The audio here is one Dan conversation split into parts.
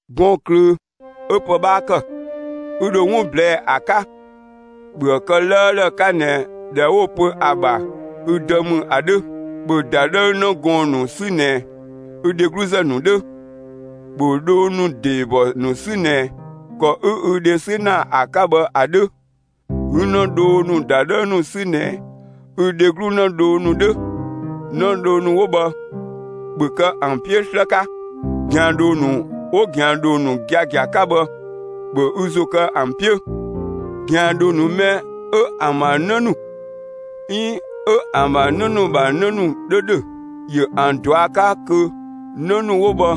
Gɔɔn‑ ꞊klöö 'ö pë 'bhaa ‑kë, 'ü dho 'wun ꞊blɛɛ'‑ ‑a 'ka, ‑bhöë kë 'lëëlë 'ka ꞊nɛ ꞊dhɛ 'wo‑ pö ‑a ‑bha ü dë ‑mü ‑a 'dhö. ‑Bhö ‑dadhëü 'në gɔɔn‑ ‑nu 'sü ꞊nɛ ü dhegluzë ‑nu 'dhö. ‑Bhö dhoo ‑nu ‑deebɔ ‑nu 'sü ꞊nɛ ‑kɔ 'ü ü dhe 'sü ‑na ‑a 'ka bhë ‑a 'dhö; 'ü 'në dhoo ‑nu ‑dadhëü ‑nu 'sü ꞊nɛ ü dheglu 'në dhoo ‑nu 'dhö. 'Në dhoo ‑nu 'wo bhë, ‑bhö kë ‑an 'piö 'slë 'ka! ꞊Gɛandhoo ‑nu 'wo ꞊gɛandhoo ‑nu giagia 'ka bhë, ‑bhö ü ‑zo kë ‑an 'piö! ꞊Gɛandhoo ‑nu mɛ 'ö ‑an ‑bha 'në ‑nu 'iin 'ö ‑an ‑bha 'në ‑bha 'në ‑nu 'dhö ‑dhö, ‑yö ‑an ꞊dua' 'ka kö 'në ‑nu 'wo bhë,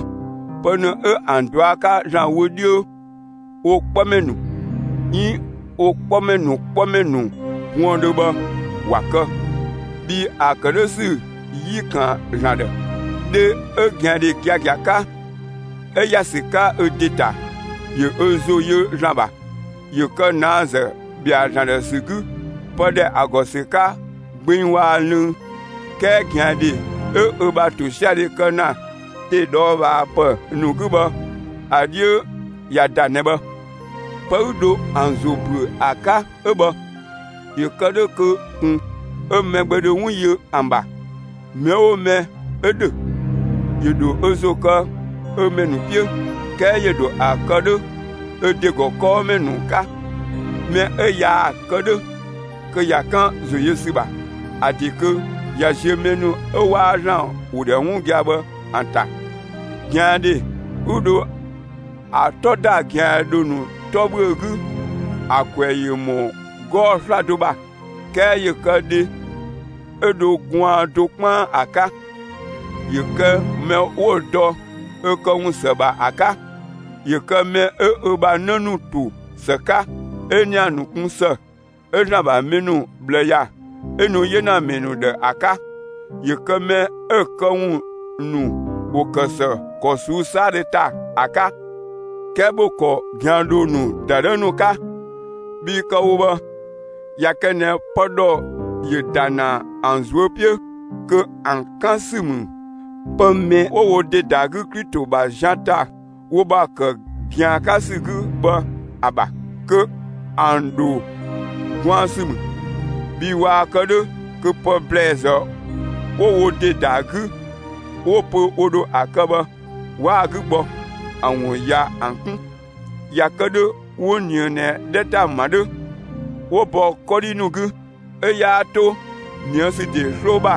pë mɛ 'ö ‑an ꞊dua' 'ka ‑Zlan wö 'dhiö wo 'kpɔmɛ ‑nu 'iin wo 'kpɔmɛ ‑nu 'kpɔmɛ ‑nu buëndhö bhë ‑wa kë, bhii ‑a kë 'dhö ‑sü 'yi ‑kan ‑Zlan ‑dhë. Dhe 'ö ꞊gɛandhe giagia 'ka, 'ö ‑ya ‑sü 'ka ö ‑de ‑ta, ‑yö ö ‑zo ‑yö ‑Zlan ‑bha, ‑yö ‑kë ꞊naazë ‑bhɛa ‑Zlan ‑dhë ‑sü 'gü pë ‑dhɛ ‑a ‑gɔ ‑sü 'ka gbeng waa‑ lënng. 'Kɛɛ ꞊gɛandhe 'ö ö ‑bha ‑tosiadhe kë ‑na ‑de ꞊dhɔɔbhaapë ‑nu 'gü bhë, ‑a 'dhiö ‑ya ‑da ꞊nɛ bhë. Pë 'ü dho ‑an ‑zo ‑büö ‑a 'ka 'ö bhë, ‑yö kë 'dhö kö ꞊kun 'ö mɛ gbɛ dho 'wun yö ‑an ‑bha. Mɛ 'oo mɛ 'ö ‑dhö, ‑yö ‑dho ö ‑zo kë ö ‑mɛ ‑nu 'piö; 'kɛɛ ‑yö ‑dho ‑a kë 'dhö ö ‑de ‑gɔ kɔɔmɛ ‑nu 'ka. Mɛ 'ö yaa‑ kë 'dhö, kö ꞊ya 'kan ‑zo yö ‑sü ‑bha; ‑a ‑de kö ꞊ya ziö mɛ ‑nu 'ö 'waa ‑Zlan ‑wo ‑dhɛ 'wun gia‑ bhë ‑an ‑ta. ꞊Gɛandhe 'ü dho ‑a 'tɔ ‑da ꞊gɛandhoo ‑nu 'tɔ ‑bhüö 'gü, ‑a ‑kwɛ ‑yö ‑mɔ 'gɔɔ‑ 'slado ‑bha; 'kɛɛ ‑yö kë dhe 'ö dho gwaan do 'kpaan ‑a 'ka. ‑Yö kë mɛ 'wo‑ dɔ ö këwun ‑së ‑bha ‑a 'ka; ‑yö kë mɛ 'ö ö ‑bha 'në ‑nu ‑to ‑së 'ka, 'ö ‑nia ‑nu 'kun ‑së, 'ö ‑Zlan ‑bha mɛ ‑nu ꞊bhlë ‑ya, 'ö nu 'yenamɛ ‑nu ‑dhë ‑a 'ka. ‑Yö kë mɛ 'ö‑ këwun ‑nu ‑wo ‑kë ‑së ‑kɔ ꞊suu'‑ 'saadhö ‑ta ‑a 'ka. 'Kɛɛ ‑bhö ‑kɔ ꞊gɛandhoo ‑nu ‑dadhëü ‑nu 'ka! Bhii kë‑ wo bhë, ꞊ya kë ꞊nɛ pë ‑dhɔ ‑yö ‑da ‑na ‑an ꞊zuö' 'piö, (kö ‑an 'kan ‑sü ‑mü pë mɛ 'wo wo ‑de ‑da 'gü Klito ‑bha zian ‑ta wo ‑bha ‑kë ꞊gɛan 'ka ‑sü 'gü bhë ‑a ‑bha); kö ‑an ‑dho gwaan ‑sü ‑mü. Bhii waa‑ kë 'dhö kö pë ‑blɛɛzë 'wo wo ‑de ‑da ‑a 'gü, 'wo‑ pö wo ‑dho ‑a kë bhë, 'waa‑ 'gü gbɔ; ‑a ‑wun ꞊ya ‑an 'kun. ꞊Ya kë 'dhö 'wo ꞊nië ꞊nɛ 'dhɛ ‑ta ‑ma 'dhö, 'wo bɔ 'kɔdhi ‑nu 'gü; 'ö 'yaa 'to ꞊nië' ‑sü ‑de 'sloo ‑bha,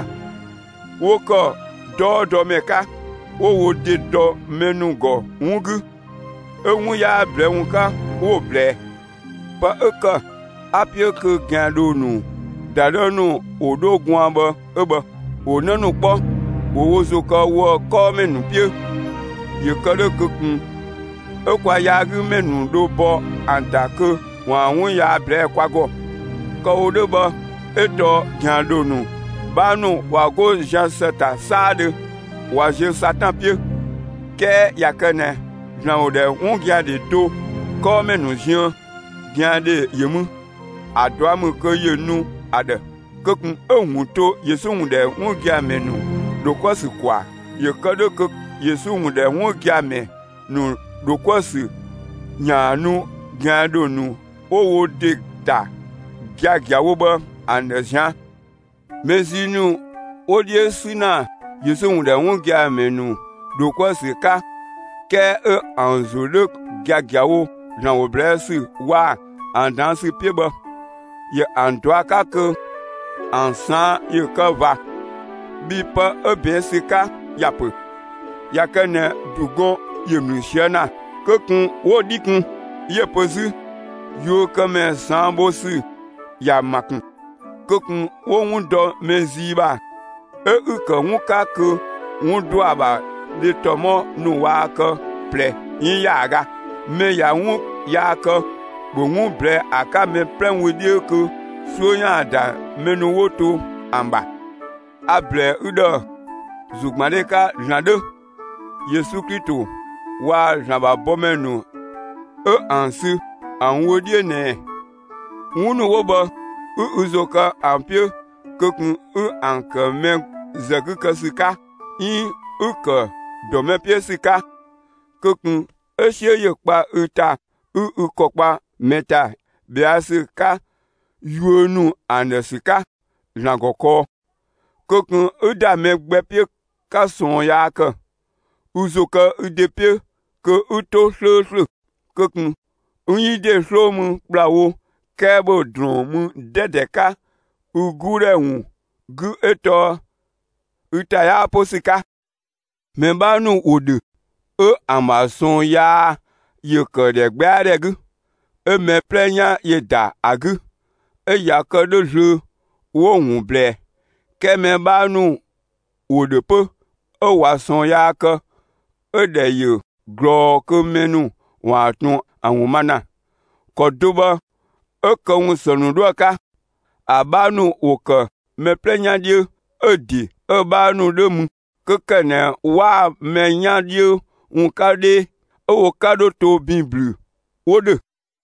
'wo ‑kë 'dɔɔdɔmɛ 'ka; 'wo wo ‑de dɔ mɛ ‑nu ‑gɔ 'wun 'gü, 'ö 'wun 'yaa ꞊blɛɛ' ‑wun 'ka, 'wo‑ ꞊blɛɛ. Pë 'ö ‑kë 'a‑ 'piö kö ꞊gɛandhoo ‑nu ‑dadhëü ‑nu ‑wo 'dho gwaan bhë 'ö bhë; ‑wo 'në ‑nu 'kpɔ; ‑wo wo ‑zo kë woë‑ 'kɔɔmɛ ‑nu 'piö, ‑yö kë 'dhö kö ꞊kun 'ö kwa yaagümɛ ‑nu dho bɔ ‑an ‑ta kö ‑waan 'wun yaa ꞊blɛɛ'‑ kwa ‑gɔ. Kë‑ wo 'dhö bhë 'ö tɔɔ ꞊gɛandhoo ‑nu 'bhaa ‑nu ꞊wa 'go zian ‑së ‑ta 'saadhö ꞊wa ziö Satan 'piö. 'Kɛɛ ꞊ya kë ꞊nɛ ‑Zlan ‑wo ‑dhɛ 'wun gia‑ ‑dhe do ‑gɔ 'kɔɔmɛ ‑nu ziën, ꞊gɛandhe ‑yö mü, ‑a ꞊dua' ‑mü kö ‑yö nu ‑a ‑dhë. Kö ꞊kun 'ö‑ ‑wun to Yesu ‑wun ‑dhɛ 'wun gia‑ ‑mɛ ‑nu ‑dho 'kuë‑ ‑sü ‑kwaa, ‑yö kë 'dhö kö Yesu ‑wun ‑dhɛ 'wun gia‑ ‑mɛ ‑nu ‑dho 'kuë‑ ‑sü ‑yaan nu ꞊gɛandhoo ‑nu 'wo wo ‑de ‑ta giagiawo bhë ‑an ‑dhë ꞊zian'. Mɛ zii ‑nu 'wo 'dhiö 'sü ‑na Yesu ‑wun ‑dhɛ 'wun gia‑ ‑mɛ ‑nu ‑dho 'kuë‑ ‑sü 'ka, 'kɛɛ 'ö ‑an ‑zo 'dhö giagiawo ‑Zlan ‑wo ꞊blɛɛ' ‑sü waa‑ ‑a ꞊daan' ‑sü 'piö bhë, ‑yö ‑an ꞊dua' 'ka kö ‑an ꞊saan' ‑yö kë ꞊va, bhii pë 'ö ꞊bɛɛn' ‑sü 'ka ‑ya ‑pö: ꞊Ya kë ꞊nɛ ‑du gɔn ‑yö ‑mlü ꞊sië' ‑na, kö ꞊kun 'wo‑ 'dhi kun, 'yö‑ pö 'zü: Yuökëmɛ ꞊saan' bho ‑sü ‑ya ‑ma ‑kun. Kö ꞊kun 'wo 'wun dɔ mɛ zii ‑bha 'ö 'ü‑ ‑kë 'wun 'ka kö 'wun ‑dɔa ‑bha dhe ‑tɔmɔ ‑nu waa kë ꞊plɛ 'iin ‑yaaga. Mɛ ꞊ya 'wun yaa kë, ‑bhö 'wun ꞊blɛɛ'‑ ‑a 'ka mɛ 'plɛ wö 'dhiö kö 'suö ‑yaan ‑da mɛ ‑nu 'wo to ‑an ‑bha. A‑ ‑blɛɛ ü ‑dhë ‑zogbandhe 'ka ‑Zlan 'dhö, Yesu Klito waa‑ ‑Zlan ‑bha bɔmɛ ‑nu 'ö ‑an sü ‑an wö 'dhiö ꞊nɛɛ 'wun ‑nu 'wo bhë 'ü ü ‑zo kë ‑an 'piö kö ꞊kun 'ü ‑an ‑kë mɛ ‑zë 'gü ‑sü 'ka 'iin 'ü‑ ‑kë ‑dɔ mɛ 'piö ‑sü 'ka! Kö ꞊kun 'ö 'siö ‑yö kpa ü ‑ta 'ü ü ‑kɔ kpa mɛ ‑ta ꞊bhɛa' ‑sü 'ka yuö ‑nu ‑a ‑dhë ‑sü 'ka ‑Zlan ‑gɔ kɔɔ. Kö ꞊kun 'ü ‑da mɛ gbɛ 'piö 'ka ꞊sɔɔn yaa ‑kë. Ü ‑zo kë ü ‑de 'piö kö 'ü 'to 'slööslö! Kö ꞊kun 'ü 'yi ‑de 'sloo mü ‑kplawo, 'kɛɛ ‑bhö ‑drɔɔn mü 'dɛdɛ 'ka ü 'guudhɛ ‑wun 'gü 'ö tɔɔ ü ‑ta 'yaa 'po ‑sü 'ka. Mɛ 'bhaa ‑nu ‑wo ‑dhö 'ö ‑an ‑bha ꞊sɔɔn yaa ‑yö ‑kë ‑dhɛgbɛadhɛ 'gü, 'ö mɛ 'plɛ 'yan ‑yö ‑da ‑a 'gü, 'ö ꞊ya kë 'dhö zlöö, 'wo‑ ‑wun ꞊blɛɛ; 'kɛɛ mɛ 'bhaa ‑nu ‑wo ‑dhö 'pö, 'ö ꞊wa ꞊sɔɔn yaa kë, 'ö‑ ‑dhɛ ‑yö ꞊glɔɔ kö mɛ ‑nu ‑waan ꞊tun ‑a ‑wun ma ‑na. ‑Kɔ do bhë 'ö këwun ‑së ‑nu 'dhoë‑ 'ka. ‑A 'bhaa ‑nu ‑wo ‑kë mɛ 'plɛ 'yan 'dhiö, 'ö‑ ‑de 'ö‑ 'bhaa ‑nu 'dhö mü; 'kö ‑kë ꞊nɛ 'waa mɛ 'yan 'dhiö ‑wun 'ka 'dhee, 'ö wo 'ka 'dho to ‑bin ‑blü 'wo ‑dhö.